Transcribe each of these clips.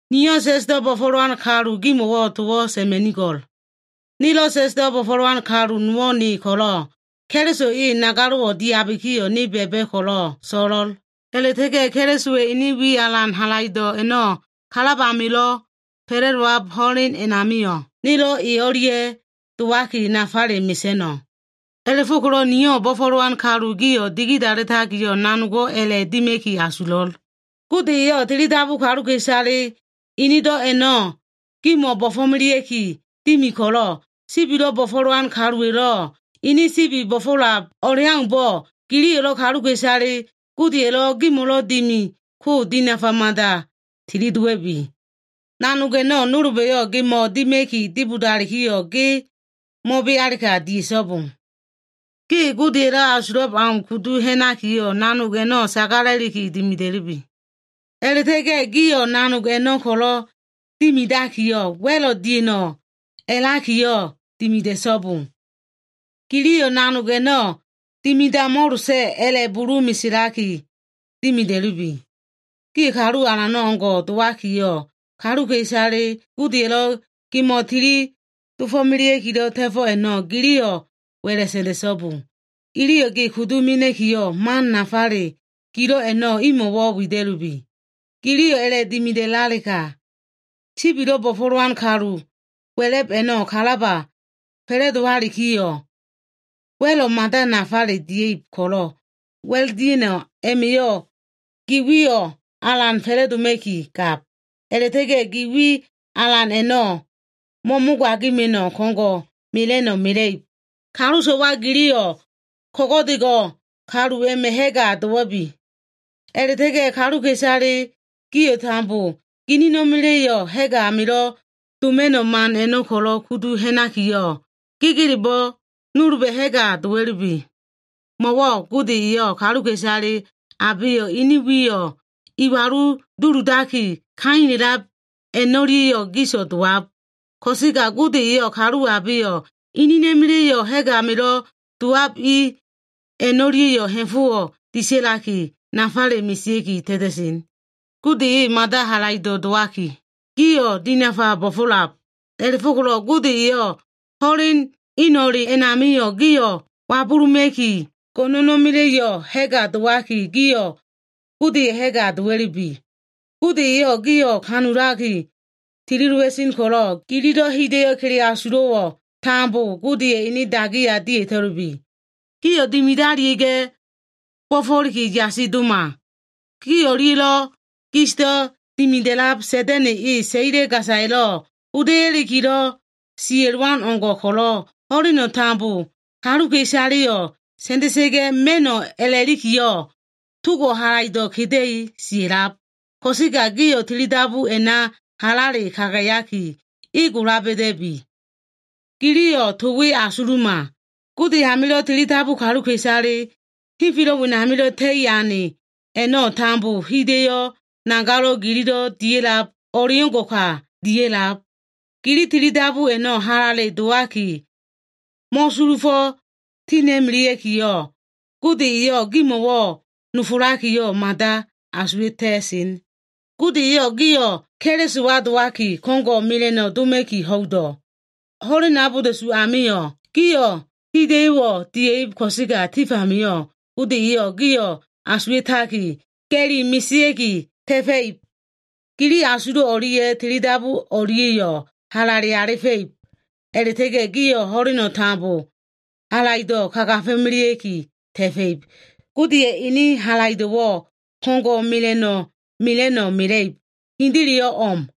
Niyo꞉ sa꞉sdo꞉ bo꞉fo꞉lowan kalu gimo꞉wo꞉ towo꞉ sa꞉ma꞉nigo꞉l. Nelo꞉ sa꞉sdo꞉ bo꞉fo꞉lowan kalu nowo꞉ ne ko꞉lo꞉, Keliso e nagalo꞉wo꞉ diabikiyo꞉ ne ba꞉ba꞉ ko꞉lo꞉ so꞉lo꞉l. A꞉la꞉ta꞉ga꞉ Kelisowa꞉ ene wi alan halaido꞉ a꞉no꞉ kalab amilo꞉ fa꞉la꞉dowab ho꞉len a꞉namio꞉, nelo꞉ e o꞉lia꞉ dowaki nafale mesa꞉no꞉. A꞉la꞉fo꞉ko꞉lo꞉ niyo꞉ bo꞉fo꞉lowan kalu gio꞉ digidalitakiyo꞉ nanogo꞉ a꞉la꞉ dima꞉ki asulo꞉. Gode eyo꞉ tilidabu kaluka꞉isale enedo꞉ a꞉no꞉ gimo꞉ bo꞉fo꞉melea꞉ki dimi ko꞉lo꞉, sibilo꞉ bo꞉fo꞉lowan kaluwa꞉lo꞉ ene sibi bo꞉fo꞉lab o꞉leaumbo꞉, giliyo꞉lo꞉ kaluka꞉isale Godeya꞉lo꞉ gimo꞉lo꞉ dimi ko dinafa mada tilidowa꞉bi. Nanog a꞉no꞉ nolba꞉yo꞉ gemo꞉wo꞉ dima꞉ki dibodalikiyo꞉, ge mo꞉bealega, dia꞉so꞉bo. Ge Godeya꞉lo꞉ asulab au kudu ha꞉nakiyo꞉, nanog a꞉no꞉ sagala꞉liki dimida꞉lubi. A꞉la꞉ta꞉ga꞉ gio꞉ nanog a꞉no꞉ ko꞉lo꞉ dimidakiyo꞉, wa꞉lo꞉ dia꞉no꞉ a꞉lakiyo꞉ dimida꞉so꞉bo. Giliyo꞉ nanog a꞉no꞉ dimidamo꞉losa꞉ a꞉la꞉ bulu meselaki dimida꞉lubi. Gio꞉ kalu alano꞉ o꞉ngo꞉ dowakiyo꞉, kaluka꞉isale Godeya꞉lo꞉ gimo꞉ tili dofo꞉melea꞉kilo꞉ ta꞉fo꞉ a꞉no꞉ giliyo꞉ wa꞉la꞉ sa꞉nda꞉so꞉bo. Iyo꞉ ge kudu mena꞉kiyo꞉, man nafale gilo꞉ a꞉no꞉ imo꞉ wida꞉lubi. Giliyo꞉ a꞉la꞉dimidalega, sibilo꞉ bo꞉fo꞉lowan kalu wa꞉la꞉b a꞉no꞉ kalaba fa꞉la꞉dowalikiyo꞉, wa꞉lo꞉ mada nafale dia꞉ib ko꞉lo꞉, wa꞉l dia꞉no꞉ a꞉ma꞉yo꞉ gi wiyo꞉ alan fa꞉la꞉doma꞉ki gab. A꞉la꞉ta꞉ga꞉ gi wi alan a꞉no꞉ mo꞉mogaima꞉no꞉, ko꞉ngo꞉ mela꞉no꞉ mela꞉ib. Kalu so꞉wa giliyo꞉ ko꞉go꞉dego꞉ kalu a꞉ma꞉ ha꞉ga dowa꞉bi. A꞉la꞉ta꞉ga꞉ kaluka꞉isale gio꞉ tambo ginina꞉ma꞉la꞉lo꞉ ha꞉g amilo꞉ doma꞉no꞉ man a꞉no꞉ ko꞉lo꞉ kudu ha꞉nakiyo꞉, gegelebo꞉ nolba꞉ ha꞉ga dowa꞉lubi. Mo꞉wo꞉ “Gode eyo꞉ kaluka꞉isale abeyo꞉ ini wiyo꞉ iwalu duludaki kaila꞉lab a꞉no꞉lia꞉yo꞉ gis dowab. Ko꞉sega Gode eyo꞉ kalu abeyo꞉ inina꞉ma꞉la꞉yo꞉ ha꞉g amilo꞉ dowab i a꞉no꞉lia꞉yo꞉ ha꞉fo꞉ disa꞉laki nafale mesea꞉ki ta꞉ta꞉sen.” Gode e mada halaido꞉ dowaki, gio꞉ dinafa bo꞉fo꞉lab. A꞉la꞉fo꞉ko꞉lo꞉ Gode eyo꞉ ho꞉len eno꞉le a꞉namio꞉ gio꞉ wabuluma꞉ki, go꞉no꞉na꞉ma꞉la꞉yo꞉ ha꞉ga dowaki, gio꞉ Godeya꞉ ha꞉ga dowa꞉lubi. Gode eyo꞉ gio꞉ kanulaki tilidowa꞉sen ko꞉lo꞉, gililo꞉ hida꞉yo꞉ kele asulo꞉wo꞉ tambo Godeya꞉ ene dagiya dia꞉ta꞉lubi. Gio꞉ dimidalia꞉ga꞉, bo꞉fo꞉liki yasi doma. Gi o꞉lia꞉lo꞉ gisdo꞉ dimida꞉lab Sa꞉da꞉na꞉ e, saila gasaya꞉lo꞉ hoda꞉yakilo꞉ sia꞉lowan o꞉ngo꞉ ko꞉lo꞉, ho꞉leno꞉ tambo kaluka꞉isaleyo꞉ sa꞉nda꞉sa꞉ga꞉ ma꞉no꞉ a꞉la꞉likiyo꞉, togo꞉ halaido꞉ keda꞉li sia꞉lab. Ko꞉sega gio꞉ tilidabu a꞉na halale kagayaki, e gola ba꞉da꞉bi. Giliyo꞉ to we asuluma. Gode amilo꞉ tilidabu kaluka꞉isale henfelo꞉ wenamilo꞉ ta꞉i ane a꞉no꞉ tambo, hida꞉yo꞉ nagalo꞉wo꞉ gililo꞉ dia꞉lab o꞉leo꞉ngo꞉ka dia꞉lab. Gili tilidabu a꞉no꞉ halale dowaki mo꞉sulufo꞉ tina꞉melea꞉kiyo꞉, Gode eyo꞉ gimo꞉wo꞉ nofolakiyo꞉, mada asuwa꞉ta꞉sen. Gode eyo꞉ gio꞉ Kelisowa dowaki, ko꞉ngo꞉ mela꞉no꞉ doma꞉ki ho꞉ido꞉. Ho꞉len abolda꞉su amio꞉ gio꞉ hida꞉yo꞉wo꞉ dia꞉ib ko꞉sega, tif amio꞉ Gode eyo꞉ gio꞉ asuwa꞉taki, ga꞉li mesea꞉ki ta꞉fa꞉ib. Gili asulo꞉ o꞉lia꞉ tilidabu o꞉lia꞉yo꞉ halale alifa꞉ib. A꞉la꞉ta꞉ga꞉ gio꞉ ho꞉leno꞉ tambo halaido꞉ kagafo꞉melea꞉ki ta꞉fa꞉ib. Godeya꞉ ene halaido꞉wo꞉ ko꞉ngo꞉ mela꞉no꞉ mela꞉no꞉ mela꞉ib. Hendeleyo꞉ o꞉m.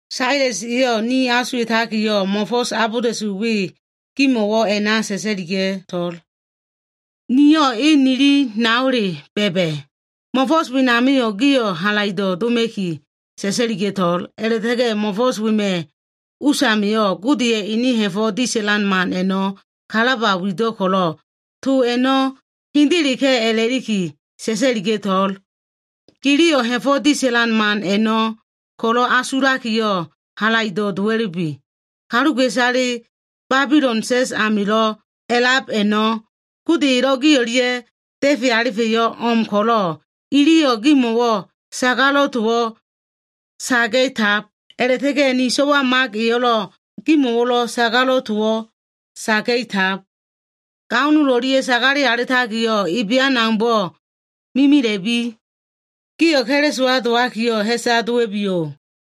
Sales eyo꞉ ne asuwa꞉takiyo꞉, mo꞉fo꞉s abolda꞉su we gimo꞉wo꞉ a꞉na sa꞉sa꞉liga꞉to꞉l. Niyo꞉ e nili naole ba꞉ba꞉. Mo꞉fo꞉s wenamio꞉, gio꞉ halaido꞉ doma꞉ki sa꞉sa꞉liga꞉to꞉l. A꞉la꞉ta꞉ga꞉ mo꞉fo꞉s wema꞉ usamio꞉, Godeya꞉ ene ha꞉fo꞉ disa꞉lan man a꞉no꞉ kalaba wido꞉ ko꞉lo꞉, to a꞉no꞉ hendeleka꞉ a꞉la꞉liki sa꞉sa꞉liga꞉to꞉l. Giliyo꞉ ha꞉fo꞉ disa꞉lan man a꞉no꞉ ko꞉lo꞉ asula꞉likiyo꞉, halaido꞉ dowa꞉lubi. Kaluka꞉isale Babilon sa꞉s amilo꞉ a꞉lab a꞉no꞉, Gode elo꞉ gi o꞉lia꞉ da꞉fe alifa꞉yo꞉ o꞉m ko꞉lo꞉, iliyo꞉ gimo꞉wo꞉ sagalo꞉ towo꞉ saga꞉tab. A꞉la꞉ta꞉ga꞉ ni so꞉wa Mak eyo꞉lo꞉ gimo꞉wo꞉ sagalo꞉ towo꞉ saga꞉tab. Gao nol o꞉lia꞉ sagale alitakilo꞉ ebean aumbo꞉ mimila꞉bi. Gio꞉ Kelisowa dowakiyo꞉, ha꞉sa dowa꞉biyo꞉.